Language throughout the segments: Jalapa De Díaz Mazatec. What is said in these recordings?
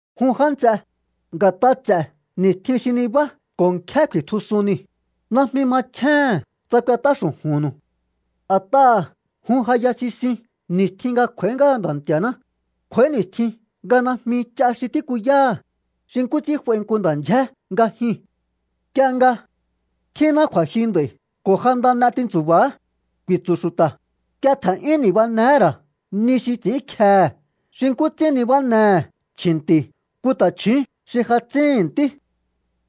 Jun já nts'e, nga̱t'a ts'e̱ ni̱stjin xi nibá ko̱ nkjé ku̱i̱tjusun niu̱, najmi machjéhe̱n tsa k'uet'á xu̱ju̱nnu̱u. A̱t'aha̱ jun ja ya sisiun ni̱stjin nga kj'u̱a̱í ngáha Nda̱ Nti̱a̱ná, kj'u̱a̱í ni̱stjin nga najmi ch'a xi tíkuyáha̱, xi nkú ts'ín f'ai nku nda̱ ndyjé nga jyuu̱n. Nk'ie nga: “Tjínná kju̱a̱jyu nd'a̱i̱ ko̱ ja nda n'e tintsu̱ba̱á”, ku̱i̱tsu̱ xu̱ta̱, nk'ie tje̱n'yún ni̱banehé ra̱ ni xi ts'i̱ínkjehe̱ xi nkú ts'ín nibánehe̱ chji̱nti̱ nku ta̱chju̱ún xi ja tsíhi̱n ntí.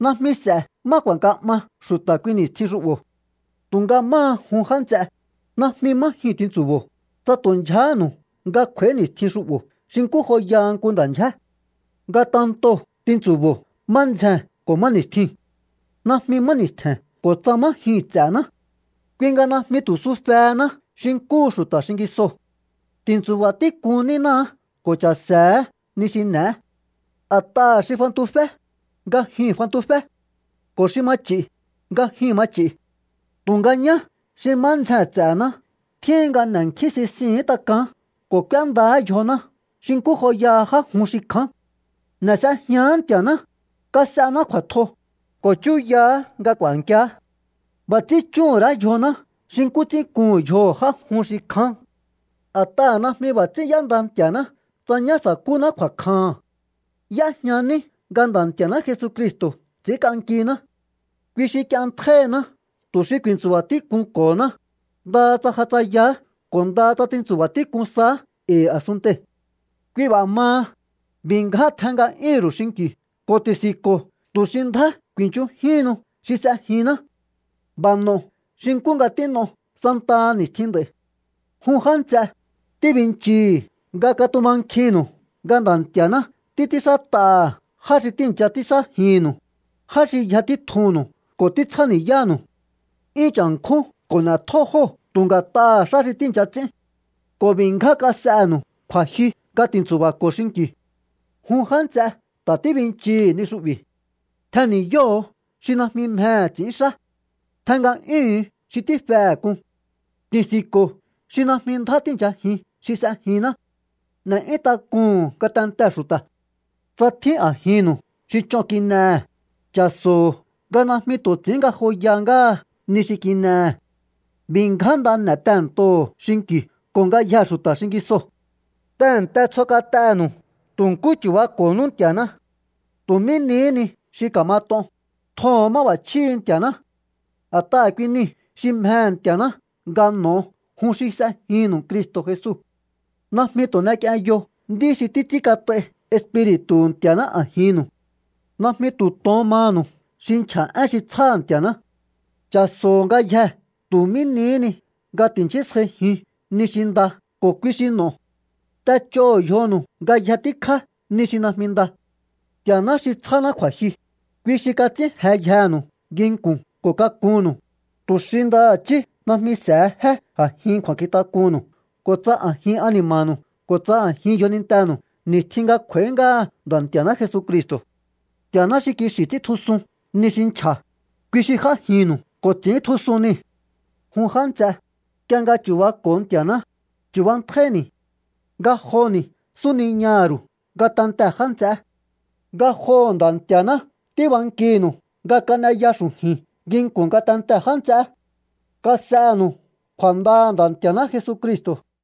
Najmi s'e̱ má ku̱a̱nka 'ma xu̱ta̱ kui ni̱stjin xu'bo̱. Tu̱nga máha jun, já nts'e, najmi má jyuu̱n tintsu̱bo̱o, tsa tu̱ ndyjahánu̱u nga kj'u̱a̱í ni̱stjin xu'bo̱ xi nkú joyaha nku nda̱ ndyjé. Ngatentoo̱ tintsu̱bo̱o má ndzjee̱n ko̱ má ni̱stjiu̱n. Najmi má ni̱stje̱n ko̱ tsa má jyuu̱n ts'e̱ná. Kui nga najmi tu̱ sufehená xi nkúhu xu̱ta̱ xingisoo̱. Ti̱ntsu̱ba̱ tík'un nínáá ko̱ cha̱se̱éhe̱ ni xi n'e̱é. A̱t'aha̱ xi fantufé, nga jyuu̱n fantufé, ko̱ xi ma ch'i̱, nga jyuu̱n ma ch'i̱. Tu̱nga ñá xi má ndzjee̱n ts'e̱ná tjíhin nga n'e̱nkjín sisihi̱ín tak'aán ko̱ k'úéndaá yjoná xi nkú joyaha já jun xi kja̱án. N'e̱ s'ejián Nti̱a̱ná, kas'ená kju̱a̱tjo, ko̱ chúyaha̱á nga k'u̱a̱nkiá. B'a̱ ts'ín chjúhu̱n ra̱á yjoná xi nkú ts'ín kuhu̱n yjoho̱ já jun xi kján. A̱t'aha̱ najmi b'a̱ ts'ín y'énda Nti̱a̱ná tsa ñá sa̱kúná kju̱a̱kjaha̱n. Y'éjña ní nga Nda̱ Nti̱a̱ná Jesucristo̱ ts'i̱ínk'ankiná. Kui xi k'ienntjáíhiná tu̱ xi ku̱i̱ntsu̱ba̱ tík'unko̱honá, ndaha tsa ja tsayaá ko̱ ndaha tsa tintsu̱ba̱ tík'un saá e̱i̱ a̱sunntei̱. Kui b'a̱ maha, b'i̱ ngján tjen nga'yúhu̱nru̱ú xinki̱u ko̱ ti̱si̱nko̱o tu̱ xi ndjá ku̱i̱nchunjíhinnu xi s'ejinná. B'a̱ n'o̱o xi nkú nga tín'o santaha ni̱stjin nd'a̱i̱. Jun já nts'e, tíbinchii̱hi̱ nga katumankjinnu̱u nga Nda̱ Nti̱a̱ná títs'ínxát'aha̱ já xi tíi̱ncha ts'ínxájinnu̱u, já xi yja títjunnu̱u ko̱ títsjáni̱yánu̱u. 'Yún cha̱nkjún ko̱ n'e̱tjó jóo̱ tu̱ nga̱t'aha̱ xá xi tíi̱ncha ts'ín. Ko̱ b'i̱ ngján kas'enu̱u kju̱a̱jyu nga tintsu̱ba̱ko̱o xinki̱u. Jun já nts'e̱, ta̱ tíbinchii̱hi̱ ni xu'bi̱. Tjen ni̱yóho̱o xi najmi mjehe̱ ts'i̱ínxá. Tjen nga'yúhu̱un xi tífehe̱ k'un. Ti̱si̱nko̱o xi najmi ndjá tíi̱nchajin xi s'ejinná. N'e̱'yún tak'uhu̱un ngatentee̱ xu̱ta̱. Tsa tjín a̱jinnu̱u xi ch'on kin'ehe̱, cha̱so̱o nga najmi tu̱ ts'i̱ín ngajoya ngáha ni xi kin'ehe̱. B'i̱ ngján nda n'e̱ tehe̱ntoho̱o xinki̱u ko̱ ngayjee̱ xu̱ta̱ xingisoo̱. Tehe̱nte tsjo kat'enu̱u. Tu̱ nkú chu̱bako̱nú Nti̱a̱ná. Tu̱ mí nihí ni xi ka̱mat'on, tjoho̱on máb'a̱chjíhi̱ Nti̱a̱ná. A̱t'aha̱ kui niu̱ xi mjehe̱ Nti̱a̱ná nga n'o̱o jun xi s'ejinnu̱u Cristo̱ Jesu. Najmi tu̱ n'ek'ienyo nd'í xi títs'ínkat'ai Espiri̱tu̱hu̱ Nti̱a̱ná a̱jinnu̱u. Najmi tu̱ tohón manu̱u xi nchja̱ én xi tsjá Nti̱a̱ná. Cha̱so̱ho̱o ngayjee̱ tu̱ mí nihí ni nga ti̱nchísjaijiun ni xi nda ko̱ kui xi n'o̱o. T'ech'óho̱o yjonu̱u ngayje tíkjá ni xi najmi nda. Nti̱a̱ná xi tsjáná kju̱a̱jyu, kui xi kats'ín jeyjenu̱u nginku̱n ko̱ kakunnu̱u, tu̱ xi ndaha̱chí najmi s'e̱he jé a̱jin kju̱a̱nkjintak'unnu̱u ko̱ tsa a̱jin ani̱ma̱nu̱u ko̱ tsa a̱jin yjonintenu̱u ni̱stjin nga kj'u̱a̱í ngáha Nda̱ Nti̱a̱ná Jesucristo̱. Nti̱a̱ná xi kixi̱ ts'íntjusun ni xi nchja̱, kui xi j'ájinnu̱u ko̱ ts'i̱íntjusun nii̱. Jun já nts'e, nk'ie nga chu̱bako̱o Nti̱a̱ná, chu̱bantjáíni̱. Ngajoni̱ súniñaha̱ ru̱u ngatentee̱ já nts'eé. Ngajoho̱ Nda̱ Nti̱a̱ná tíbankihi̱nu̱u nga kan'eya xu̱ju̱i̱n nginku̱n ngatentee̱ já nts'eé. Kas'enu̱u kju̱a̱ndaha̱ Nda̱ Nti̱a̱ná Jesucristo̱.